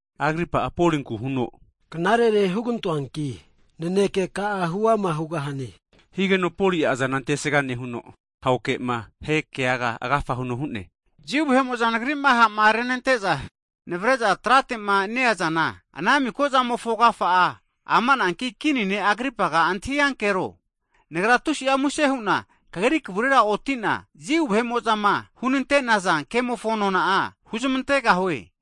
Agripa'a, Polinku huno knarere hugantoanki naneke ka'a huama hugahane higeno, Poli'a azana ometre emetre nehuno ahoke'ma ahekeaga agafa huno hu'ne. Jiu vahe'mo'za nagri'ma ha'ma renante'za navare'za tratema neazana ana mika zamofo agafa'a amananki Kini ne' Agripaga antahi'ankero, nagra tusi'a muse hu'na kagri kavurera oti'na, Jiu vahe'mo'zama hunante'naza kemofo nona'a huzmantegahue.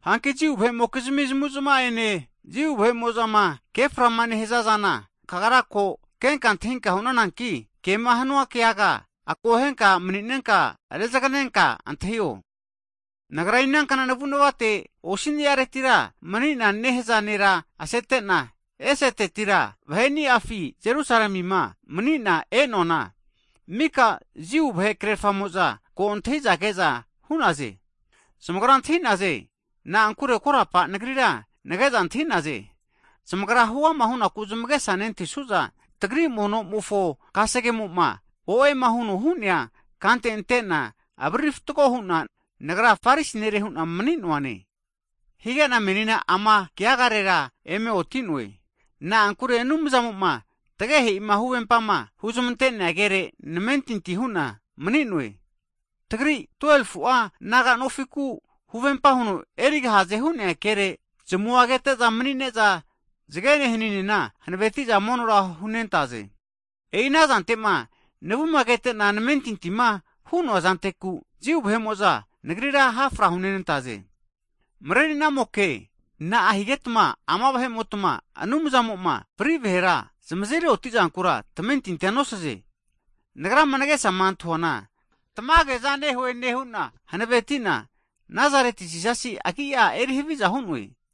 Hanki Jiu vahe'mokizmi zamu'zma'ene, Jiu vahe'mo'zama keframa nehaza zana, kagra ko kenka antahinka hu'nananki, kema hanua keaga akohenka mani'nenka rezaganenka antahio. Nagra inankna navu'navate osi'niaretira mani'na nehaza nera asete'na, esetetira vahe'niafine Jerusalemima mani'na e'noana, mika Jiu vahe krerafamo'za ko antahi'za ke'za hu'naze. Zamagra antahi'naze, na'ankure korapa nagrira nage'za antahi'naze. Zamagra huama hu'naku zamagesa nentahisu'za, tagri mono'mofo kasegemo'ma, o'ema huno hu'nea kante ante'na avariri fatgo hu'na nagra Farisi nere hu'na mani'noane. Hige'na menina ama keagarera eme oti'noe, na'ankure Anumzamo'ma tagehe'ima huvempama huzmante'nea kere namentinti hu'na, mani'noe. Tagri 12fu'a naga'nofiku huvempa huno erigahaze hu'nea kere zamua kete'za mani'ne'za, zagene haninena hanaveti'za monora hunentaze. E'i anazante'ma navuma ketena namentintima hu'noa zanteku, Juda vahe'mo'za nagrira hafra hunenantaze. Mareri'namoke! (king) Na'a higetma ama vahe'motma Anumzamo'ma fri vahera zamazeri oti'zankura tamentinti nosaze? Nagrama nagesama antahi'noana tamageza nehue nehu'na hanaveti'na, Nazareti Jisasi agi'a eri haviza hu'noe.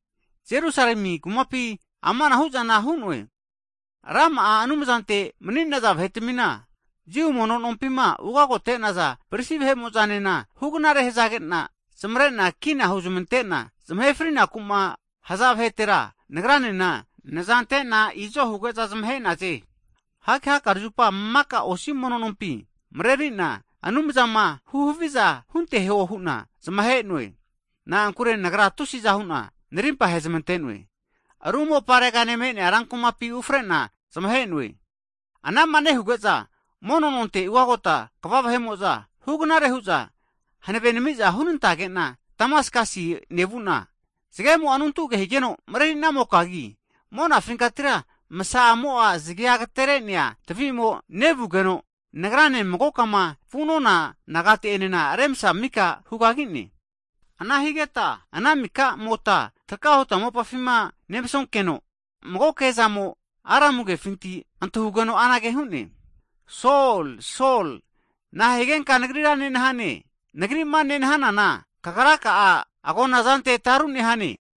Jerusalemi kumapina amanahu'zana hu'noe. Rama'a Anumzante mani'naza vahetamina, Jiu mono nompima ugagote'naza prisi vahe'mo'zanena hugnare hazage'na zamare'na kina huzamante'na, zamahe frinaku'ma haza vahetera nagranena nazante'na izo huge'za zamahe'naze. Hanki hakare zupa maka osi mono nompi mareri'na Anumzama huhaviza hunteho hu'na zamahe'noe. Na'ankure nagra tusi'za hu'na narimpa hezmante'noe. Ru moparegane me'nea ra kumapina ufre'na zamahe'noe. Anama nehuge'za, mono'nonte ugagota kva vahe'mo'za hugnare hu'za hanave nenami'za hunantage'na Damaskasi nevu'na, zagemo'a anuntu age12 kiloki higeno, mareri'namokagi (king) monafinkatira msa a'mo'a zagea agatere'nea tvi'mo nevugeno, nagrane magokama vu'nona nagate enena remsa mika hugagi'ne. Ana higeta ana mika'mota traka huta mopafima nemsonkeno, mago kezamo'a Aramu (Hibru) kefinti antahugeno anage hu'ne, Sol, Sol, na'a higenka Nagrira nenahane? Nagri'ma nenahanana, kagra ka'a agonazante tarunehane.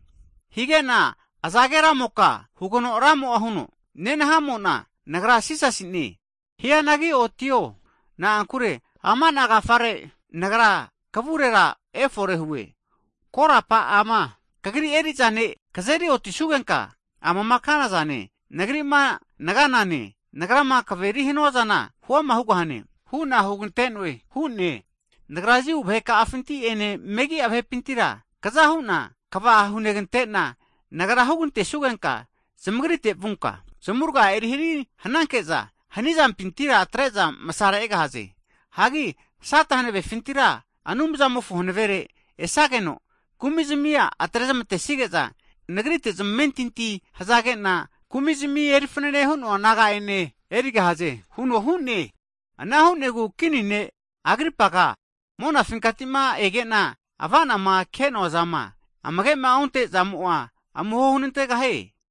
Hige'na azage Ramoka? hugeno Ramo'a huno, nenahamo'na Nagra Jisasi'ne. Hianagi otio, na'ankure ama'na agafare, Nagra kavurera efore hue, korapa ama kagrira eri'za ne' kazeri otisugenka, amama kana zane, Nagri'ma naganane, Nagrama kaveri hanuazana huama hugahane hu'na huganteno hu'ne. Nagra Jiu vahe ka'afinti'ene megi'a vahepintira kza hu'na kava hunegante'na, Nagra hugantesugenka zamagrite vunka, zamurga erihari hananke'za hani'zampintira atre'za msare egahaze. Hagi Sata hanavefintira Anumzamofo hanavere esageno, kumi'zamia atrezamantesnige'za, Nagrite zamentinti hazage'na, kumi'zmi eri fanane hu'noa naga'enena erigahaze huno hu'ne. Ana hu'negu, Kini Agripaga, monafinkati'ma ege'na ava'nagnazama ke'noazama amage'ma onte'zamo'a amuho hunantegahie.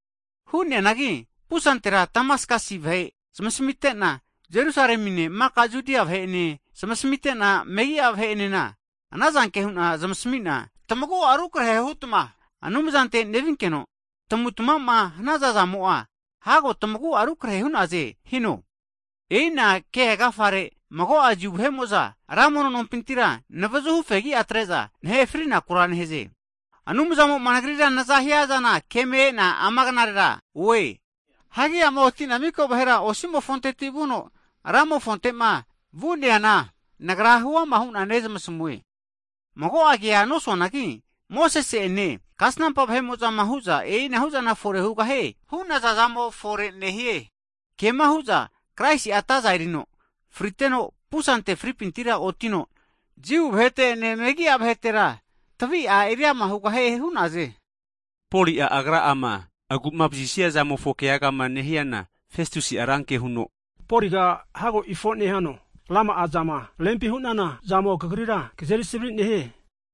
Hu'neanagi pusantera Damaskasi vahe zamasmite'na, Jerusalemine maka Judia vahe'enena zamasmite'na megi'a vahe'enena anazanke hu'na zamasmi'na, tmagu'a rukarehe hutma Anumzante nevinkeno, tamu'tmama hanaza zamo'a, hago tamagua rukarehe hu'naze hino. E'ina kegafare mago'a Jiu vahe'mo'za ra mono nompintira navuzuhu fegi'atre'za, nahe fri'nakura nehaze. Anumzamo'a nagrira naza hiazana keme e'na ama knarera oe. Hagi ama oti'na mika vahera osi'mofonteti vuno ramofonte'ma vu'neana, nagra huama hu'na nezmasmue. Mago'a kea nosuanagi, Mosese'ene, kasnampa vahe'mo'zama hu'za, e'inahu'zana fore hugahie hu'naza'zamo fore nehie. Kema hu'za Kraisi'a ataza erino friteno pusante fri'pintira otino, Jiu vahete'ene megi'a vahetera tavi'a eri ama hugahie hu'naze. Polima agra'ama agu'mavazisia zamofo keagama nehiana, Festusi'a ranke huno Poliga hago ifo nehano! Ra'ma'a zama rempi hu'nana zamo kagrira kazeri savari'nehie!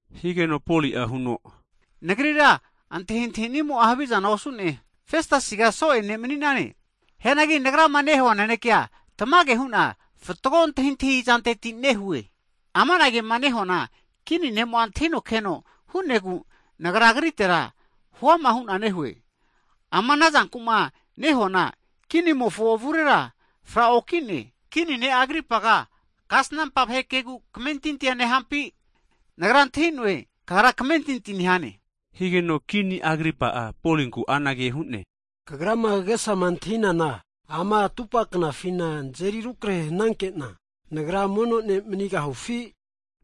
Higeno Poli'a huno, Nagrira antahintahinimo'a havizana osu'ne, Festasiga so'e ne' mani'nane. Hianagi nagrama nehua nanekea tamage hu'na fatgo antahintahizanteti nehue. Amana kema nehuana Kini ne'mo'a antahino keno hu'negu nagra agritera hu'ama hu'na nehue. Ama anazanku'ma nehuana kinimofo avurera fra'okine. Kini ne' Agripaga kasnampa vahe kegu kamentinti'a nehampi? Nagra antahi'noe, kagra kamentinti nehane. Higeno Kini Agripa'a Polinku anage hu'ne, Kagrama kagesa antahinana ama atupa knafina nazeri rukarehe hanankena, nagra mono ne' manigahufi?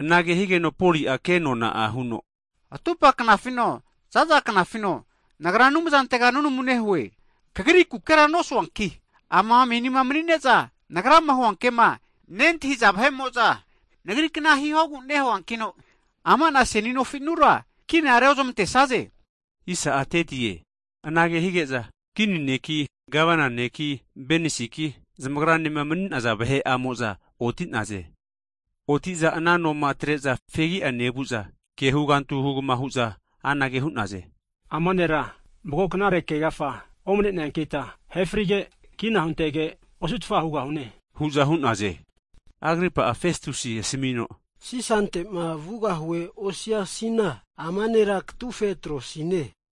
Anage higeno Poli'a kenona'a huno, atupa knafino, za'za knafino nagra Anumzantega nunamu nehue, kagrikukera nosuanki ama menima mani'ne'za nagrama huanke'ma nentahiza vahe'mo'za, nagrikna hihogu nehuankino, ama'na seni nofinura kina reozmante'saze. Anage hige'za, Kini neki, Gavana neki Benesiki, zamagranema mani'naza vahe'amoza oti'naze. Oti'za ana noma atre'za fegi'a nevu'za, ke huganti hugama hu'za anage hu'naze. Ama'na nera mago knare ke agafa omaneneankita ahe frige' kina huntege osu'tfa hugahune, hu'za hu'naze. Agripa'a, Festusi asmi'no, Sisante'ma vugahue osiasina, ama nera katufe atrosine.